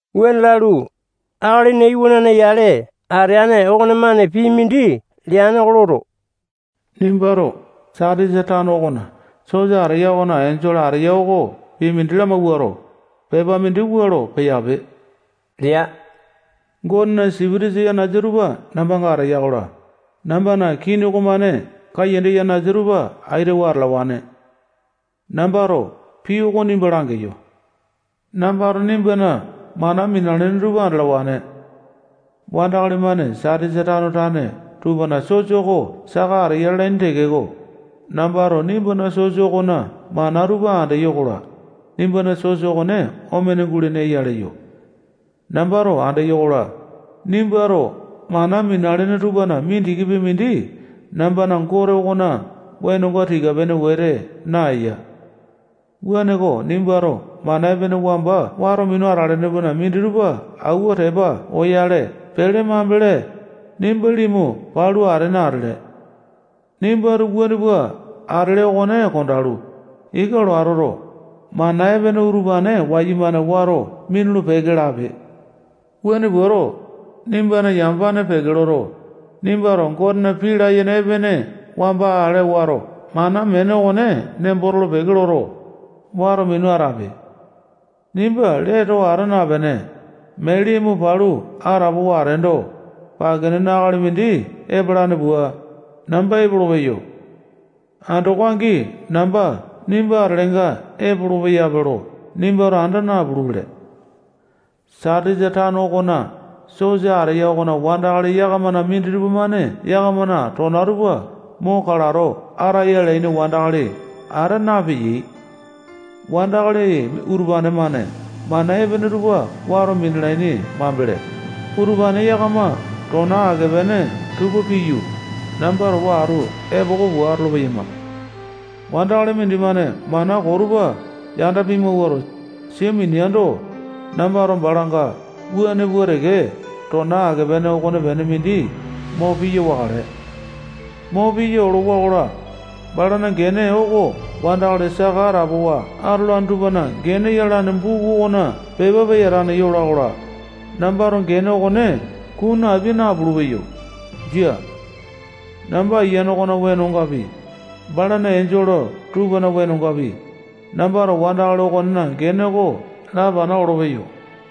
Wuane lalu, Akalina Iwanane yale ateane okonemane pii mindi leane oko loto, nimbato Satisa tano okona sosa ateya okona enjole ateya oko pii mindi lamawuato, pepa mindi wua lo peyape lea. Gotena sipitisa yanasa tupa nambanga ateya-kola, nambana kini okomane kaiyanda yanasa tupa aitawa atalawane. Nambato pii oko nimba langeyo. Nambato nimbana mana minalene tupa andalawane. Wandakali-mane Satisa tano tane tupana sosa oko saka ateya lalaini tekeko, nambato nimbana sosa okona mana tupa andeyo-kola, nimbana sosa okone omene gulene eya leyo. Nambato andeyo-kola, nimbato mana minalene tupana mindikipi mindi nambana Gote okona wenonga tika-pene wete naeya. Wuaneko, nimbato mana epene wamba wato minu atalene tupana minditupa auwa tepa oyale pele mambele, nimba limu palu atene atele. Nimbato wuane pua atele okone kondalu, ika lo atoto, mana epene utupane wayumane wato minulu-peke lape. Wuane puato, nimbana yamapane peke loto, nimbato Gotena pii layene epene wamba ale wato mana meene okone nembo tolo-peke loto, wato minu atape. Nimba lee too ata napene, mee limu palu atapowa ateendo, pake nene akali mindi epalane pua, namba epolopeyo. Andoko angi namba nimba atelenga epolopeya lo nimbato anda napulupele. Satisa tano okona sosa ateya okona wandakali yakamana minditupa-mane yakamana tona tupa mo kalato ataya alaini wandakali ata napeyai. Wandakali utupane-mane mana epene tupa wato minalaini mambele, utupane yakama tona ake-pene tupa piyu, namba towa atu epoko pua atolo-peyama. Wandakali mindimane mana koo tupa yanda pimawuato, sia mineando, nambato balanga wuane pua teke tona ake-pene okonepene mindi mo piya wakale. Mo piya olowa-kola, balana gene oko wandakali saka atapowa atolane tupana gene yalane buku okona pepa peyatane yola-kola, nambato gene okone kunu apia napulu-peyo. Jia. Namba Ayiane okona wenongapi, balana enjole tupana wenongapi, nambato wandakali okonena gene oko lapana olopeyo.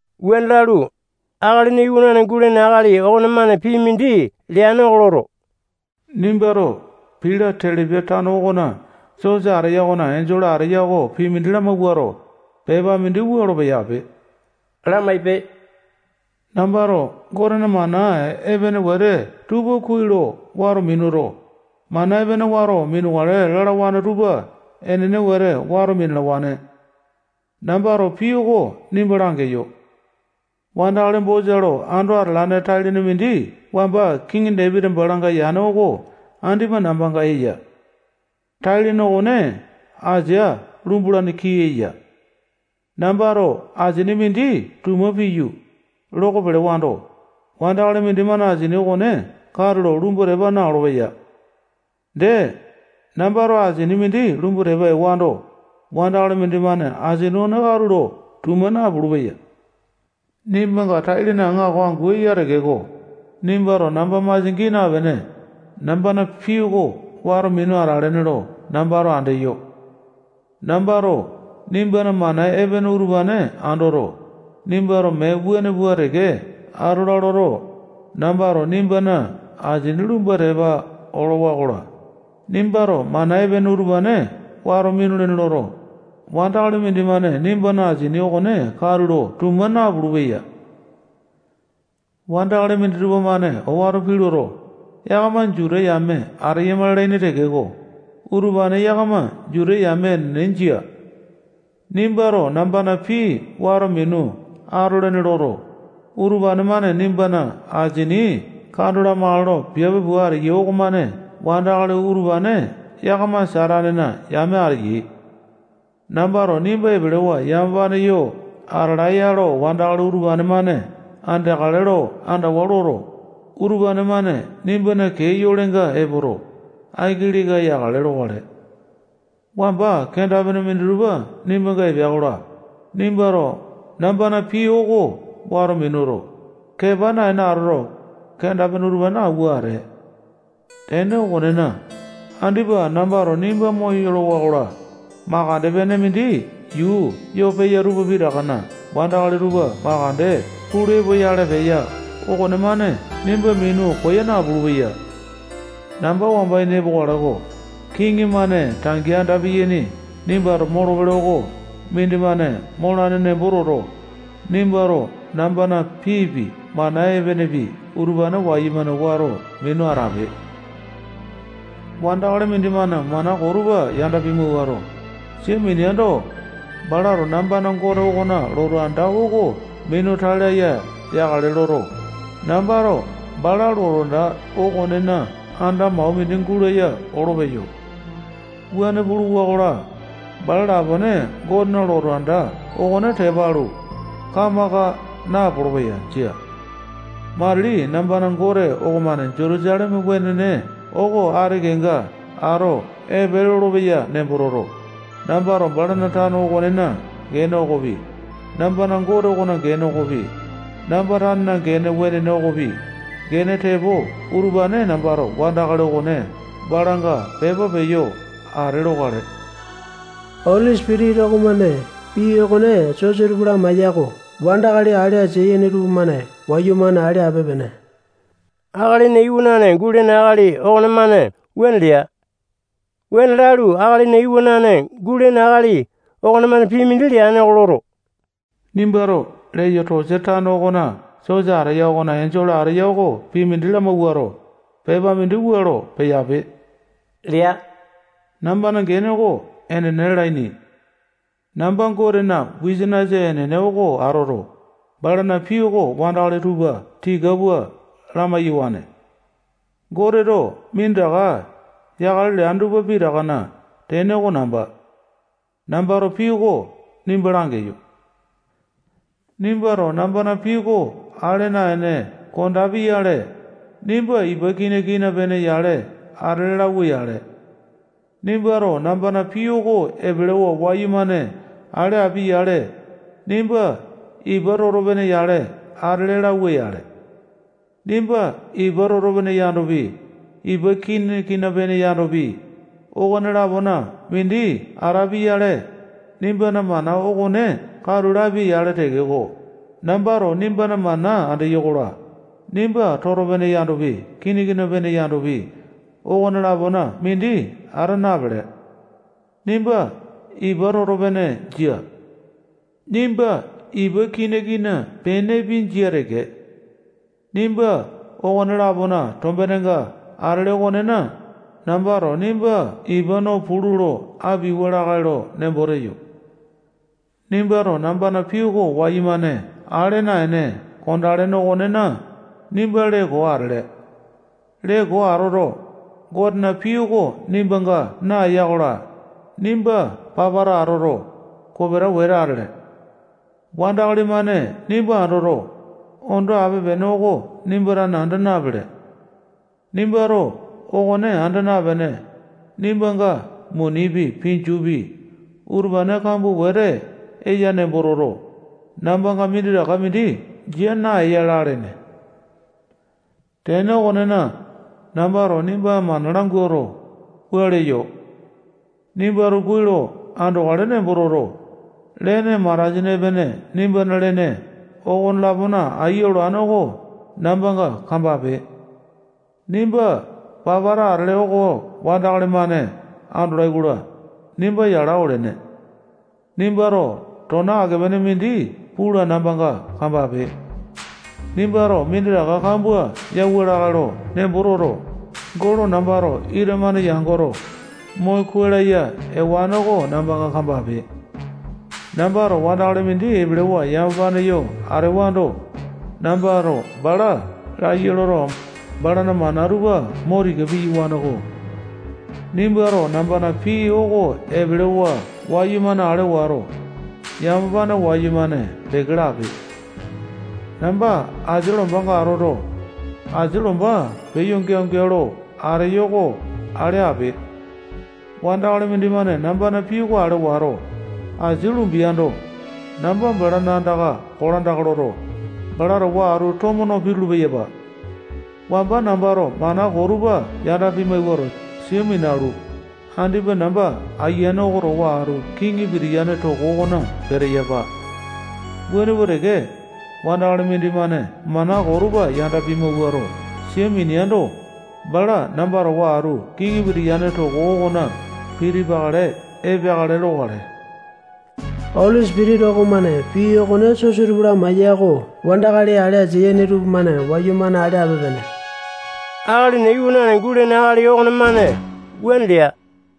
Wuane lalu, Akalina Iwanane gulene akali okonemane pii mindi leane oko loto, nimbato Pila-telepia tano okona sosa ateya okona enjole ateya oko pii mindi lamawuato, pepa mindi wua lo peyape lamaipe: Nambato Gotena mana epene wete tupa kuai lo wato minuto, mana epene wato minukale lalawane tupa enene wete wato minalawane. Nambato pii oko nimba langeyo. Wandakali bosa lo ando atalane tai-lene mindi wamba kiŋi Dapiti balanga yane oko andipa nambanga eya. Tai-lene okone asia lumbalane kii eya. Nambato asini mindi tuma piyu, loko pelewando, wandakali mindimane asini okone katulo lumbu tepa na-olopeya. Dee, nambato asini mindi lumbu tepa ewando, wandakali mindimane asini okone katulo tuma napulu-peya. Nimbanga tai-lene aŋako angu eya tekeko, nimbato namba masia gii napene, nambana pii oko wato minu atalene lo nambato andeyo. Nambato nimbana mana epene utupane andoto, nimbato mee wuane pua teke atola loto, nambato nimbana asini lumbu tepa olowa-kola, nimbato mana epene utupane wato minulene loto, wandakali mindimane nimbana asini okone katulo tuma napulu-peya. Wandakali minditupa-mane owato pii loto, yakama Juta yame ateyama lalaini tekeko, utupane yakama Juta yame enene jia. Nimbato nambana pii wato minu atolene loto, utupane-mane nimbana asini kando lamakale lo piape pua ateyai okomane wandakali utupane yakama Satanena yame ateyai. Nambato nimba epelewa yamapane yo atalae-ya lo wandakali utupane-mane andeakale lo andawa loto, utupane-mane nimbana kee yolenga epoto, aiki leka yakale lokale. Wamba kenda-pene minditupa nimbanga epea-kola, nimbato nambana pii oko wato minuto, kepa naene atoto, kenda-pene utupane auwa atee. Tene okonena, andipa nambato nimba moyolowa-kola, makande-pene mindi yuu yo peya tupa pitakana wandakali tupa makande pulu epoyale peya okonemane nimba minu koya napulu-peya. Namba wamba ini epokale-ko. Kiŋi-mane tangi anda piyaini nimbato molopele oko mindimane molane nembo toto, nimbato nambana piipi, mana epenepi, utupane wayumane wato minu atape. Wandakali mindimane mana koo tupa yanda pimawuato, sia mineando, balato nambana Gote okona lotu anda oko minu tai laya yakale loto, nambato bala lotu anda okonena anda mau mindi gulaya olopeyo. Wuane puluwa-kola, bala lapone Gotena lotu anda okone tepa alu, kamaka napolo-peya. Jia. Matili nambana Gote okomane Jutusaleme wenene oko ati kenga ato epe lolopeya nembo toto, nambato balana tano okonena gene okopi, nambana Gote okona gene okopi, namba tanena gene wenene okopi, gene tepo utupane nambato wandakali okone balanga pepa peyo ate lokale. Oli Sipitisa okomane pii okone sosa tupa lamaeya oko wandakali ale asia yene tupamane wayumane ale ape-pene. Akalina Iwanane gulene akali okonemane wuane lea. Wuane Lalu, Akalina Iwanane gulene akali okonemane pii mindi leane oko loto, nimbato Leyotosiya tano okona sosa ateya okona enjole ateya oko pii mindi lamawuato, pepa mindi wua lo peyape lea. Nambana gene oko Enene lalaini. Namba Gotena wisanisa enene oko atoto, balana pii oko wandakali tupa tika pua lamai-yawane. Goteto minditaka yakale leane tupa pitakana tene oko namba. Nambato pii oko nimba langeyo. Nimbato nambana pii oko ale naene kondapi-yale, nimba ipa kina-kina pene yale atele lauwa-yale. Nimbato nambana pii oko epelewa wayumane ale api-yale, nimba ipa toto-pene yale atele lauwa-yale. Nimba ipa toto-pene yandopi, ipa kina-kina pene yandopi, okone-lapona mindi atapi-yale, nimbana mana okone katu lapia-yale tekeko, nambato nimbana mana andeyo-kola, nimba toto-pene yandopi, kina-kina pene yandopi, okone-lapona mindi ata napele. Nimba ipa toto-pene jia. Nimba ipa kina-kina penepi, jia teke. Nimba okone-lapona tombenenga atele okonena, nambato nimba ipa no pulu lo apiauwa lakae lo nembo teyo. Nimbato nambana pii oko wayumane ale naene kondalene okonena, nimba lee koo atele. Lee koo atoto, Gotena pii oko nimbanga naeya-kola, nimba papata atoto, kopeta wete atele. Wandakali-mane nimba andoto, ondo ape-pene oko nimba tane anda napele. Nimbato okone anda napene, nimbanga munipi, pinjupi, utupane kambua wete eya nembo toto, nambanga minditaka mindi jia naeya lalene. Tene okonena, nambato nimba mana languato, wua leyo: Nimbato kuai lo andokale nembo toto, lene matasini epene nimbana lene okolapona aiya olane oko nambanga kambape. Nimba papata atele oko wandakali-mane andolai-kola, nimba yala olene. Nimbato tona ake-pene mindi pula nambanga kambape. Nimbato minditaka kambua yauwa lakae lo nembo toto, golo nambato ita-mane yangoto, mo kuai laya ewane oko nambanga kambape. Nambato wandakali mindi epelewa yamapane yo atewando, nambato bala laiya loto, balana mana tupa mo tika piyawane-ko. Nimbato nambana pii oko epelewa wayumane ale wato, yamapane wayumane peke lape. Namba anda asia lombanga atoto, asia lomba peyo geao-geao lo ateyo oko ale ape. Wandakali mindimane nambana pii oko ale wato, asia lumbiando, namba balana andaka kolandaka loto, bala towa atu tomo no pitulu-peyapa. Wamba nambato mana koo tupa yanda pimawuato, sia minalu, andipa namba Ayiane oko towa atu kiŋi pitiyane toko okona peteyapa. Wuane pua teke, wandakali mindimane mana koo tupa yanda pimawuato, sia mineando, bala namba towa atu kiŋi pitiyane toko okona pitipakale epeakale lokale. Oli Sipitisa okomane pii okone sosa tupa lamaeya oko wandakali ale asia yene tupamane wayumane ale ape-pene. Akalina Iwanane gulene akali okonemane wuane lea.